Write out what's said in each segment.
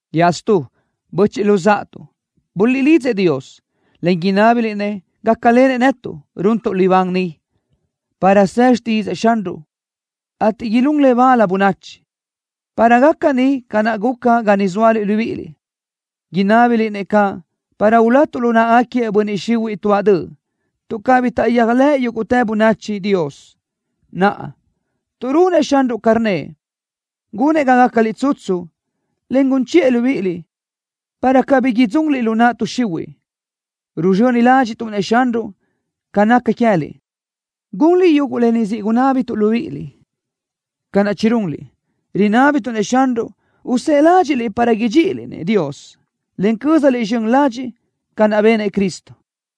Iaʼstú, böchiʼ luzáʼatuʼ, buliʼlidzëʼ Dios, en inábiliʼ-nëʼ gácalenëʼ netuʼ, runtuʼ libán ni, para së xtídzëʼë Xanruʼ, ateʼ ilún le bal bönachi, para gaca ni ca naʼ guca ga niʼ zóaliʼ libíʼiliʼ. Inábiliʼ-nëʼ caʼ para ulatuʼ lu náʼagaquiëʼ bönniʼ xihuiʼ tuáʼ döʼ, tuʼ cabí taʼyéajlëʼ yúguʼtë bönachi Dios. Naʼa, tuʼ runëʼ Xanruʼ ca rnnëʼ, gunëʼ ga gácaliʼ tsutsu, en gun chiʼë libíʼiliʼ, para cabí idzunliʼ lu naʼ tuʼ xihuiʼ. Ruzxöni ládxiʼtuʼ-nëʼ Xanruʼ ca naca queë́liʼ, gunliʼ yuguʼ lë ni siʼ gunábituʼ libíʼiliʼ, ca naʼ chirunliʼ. Rinábituʼ-nëʼ Xanruʼ usë́ʼë ládxiʼliʼ para idxíʼiliʼ-nëʼ Dios, en cö́zaliʼ zxön ladxiʼ ca naʼ benëʼ Cristo.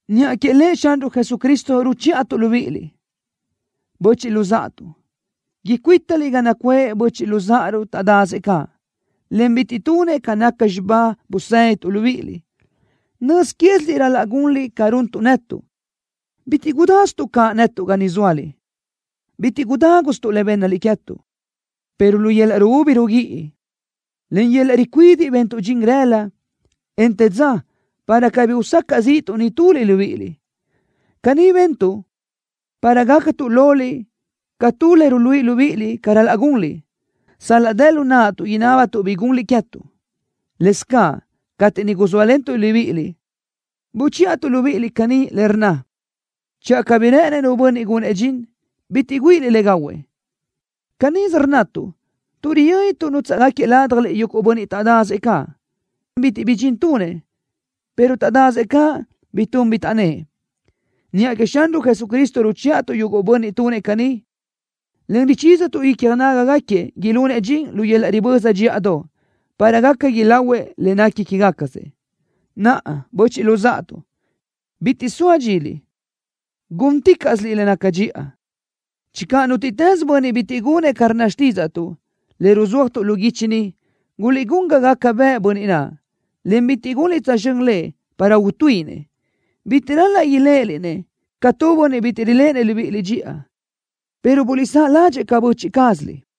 Niʼa que Lëʼ Xanruʼ Jesucristo ruchíʼatuʼ libíʼiliʼ, böchiʼ luzáʼatuʼ, icuítaliʼ ga nacuʼë böchiʼ luzáʼaruʼ taʼdasëʼ caʼ, en bitiʼ tunëʼ ca naca xibá busédituʼ libíʼiliʼ. Nöz quéziliʼ ral-laʼ gunliʼ ca runtuʼ netuʼ. Bitiʼ gudásituʼ caʼ netuʼ ga niʼ zóaliʼ. Bitiʼ gudágusötuʼ le bénnaliʼ queë́tuʼ, pero lu yöl-laʼ ruúbi ruguíʼi, en lu yöl-laʼ ricuidiʼ bentuʼ dxin rëla, en te dza para cabí usacaʼ zíʼituʼ nituliʼ libíʼiliʼ. Caní bentuʼ para gácatuʼ loliʼ ca tu le ruluíʼi libíʼiliʼ ca ral-laʼ gunliʼ, sal-laʼ dë lu naʼtuʼ inábatuʼ bi gunliʼ queë́tuʼ. Lëscaʼ cateʼ niʼ guzóalentuʼ libíʼiliʼ, buchíʼatuʼ libíʼiliʼ caní, le rnna: “Channö cabí rë́ʼënëʼ nu bönniʼ gunëʼ dxin, bitiʼ güíʼiliʼ le gahuëʼ.” Canísö rnnatuʼ tuʼ riyö́nituʼ nútsaʼgaquiëʼ ládjaliʼ yuguʼ bönniʼ taʼdasëʼ caʼ, bitiʼ bi dxin tunëʼ, pero taʼdasëʼ caʼ bi tun bi taʼnnë́ʼ. Niʼa queëʼ Xanruʼ Jesucristo ruchíʼatuʼ yuguʼ bönniʼ tunëʼ caní, en richízatuʼ icja nágagaquiëʼ ilunëʼ dxin lu yöl-laʼ riböza dxíʼadoʼ, para gaca ilahuëʼ le nequi quégacasëʼ. Naʼa, böchiʼ luzáʼatuʼ, bitiʼ soa dxiliʼ, gúnticaʼsiliʼ le naca dxiʼa. Channö nútiʼtës bönniʼ bitiʼ gunëʼ ca rnna xtídzaʼtuʼ, le ruzúajtuʼ lu guichi ni, guliʼgún ga gaca bëʼë bönniʼ naʼ, en bitiʼ gunliʼ tsözxö́n lëʼ para utuíʼinëʼ. Bitiʼ ral-laʼ iléʼeliʼ-nëʼ ca tu bönniʼ bitiʼ riléʼenëʼ libíʼiliʼ dxiʼa, pero guliʼsáʼ ládxëʼë ca böchiʼ cázaliʼ.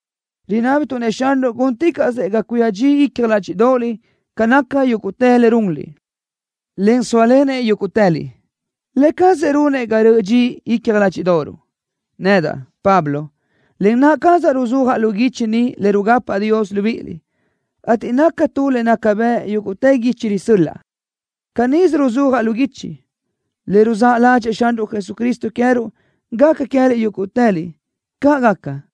Rinábituʼ-nëʼ Xanruʼ gúnticaʼsëʼ ga cuía dxi icja ládxiʼdoʼoliʼ ca naca yúguʼtë le runliʼ, en sóalenëʼ yúguʼtëliʼ. Lë cazëʼ runëʼ ga röʼö dxi icja ládxiʼdoʼoruʼ. Nedaʼ, Pablo, len naʼ cazaʼ ruzúajaʼ lu guichi ni le rugapaʼ Dios libíʼiliʼ, ateʼ naca tu le naca bëʼ yúguʼtë guichi risö́l-laʼa. Canísö ruzúajaʼ lu guichi. ¡Le ruzáʼ ládxëʼë Xanruʼ Jesucristo queë́ruʼ gaca queë́liʼ yúguʼtëliʼ! ¡Caʼ gaca!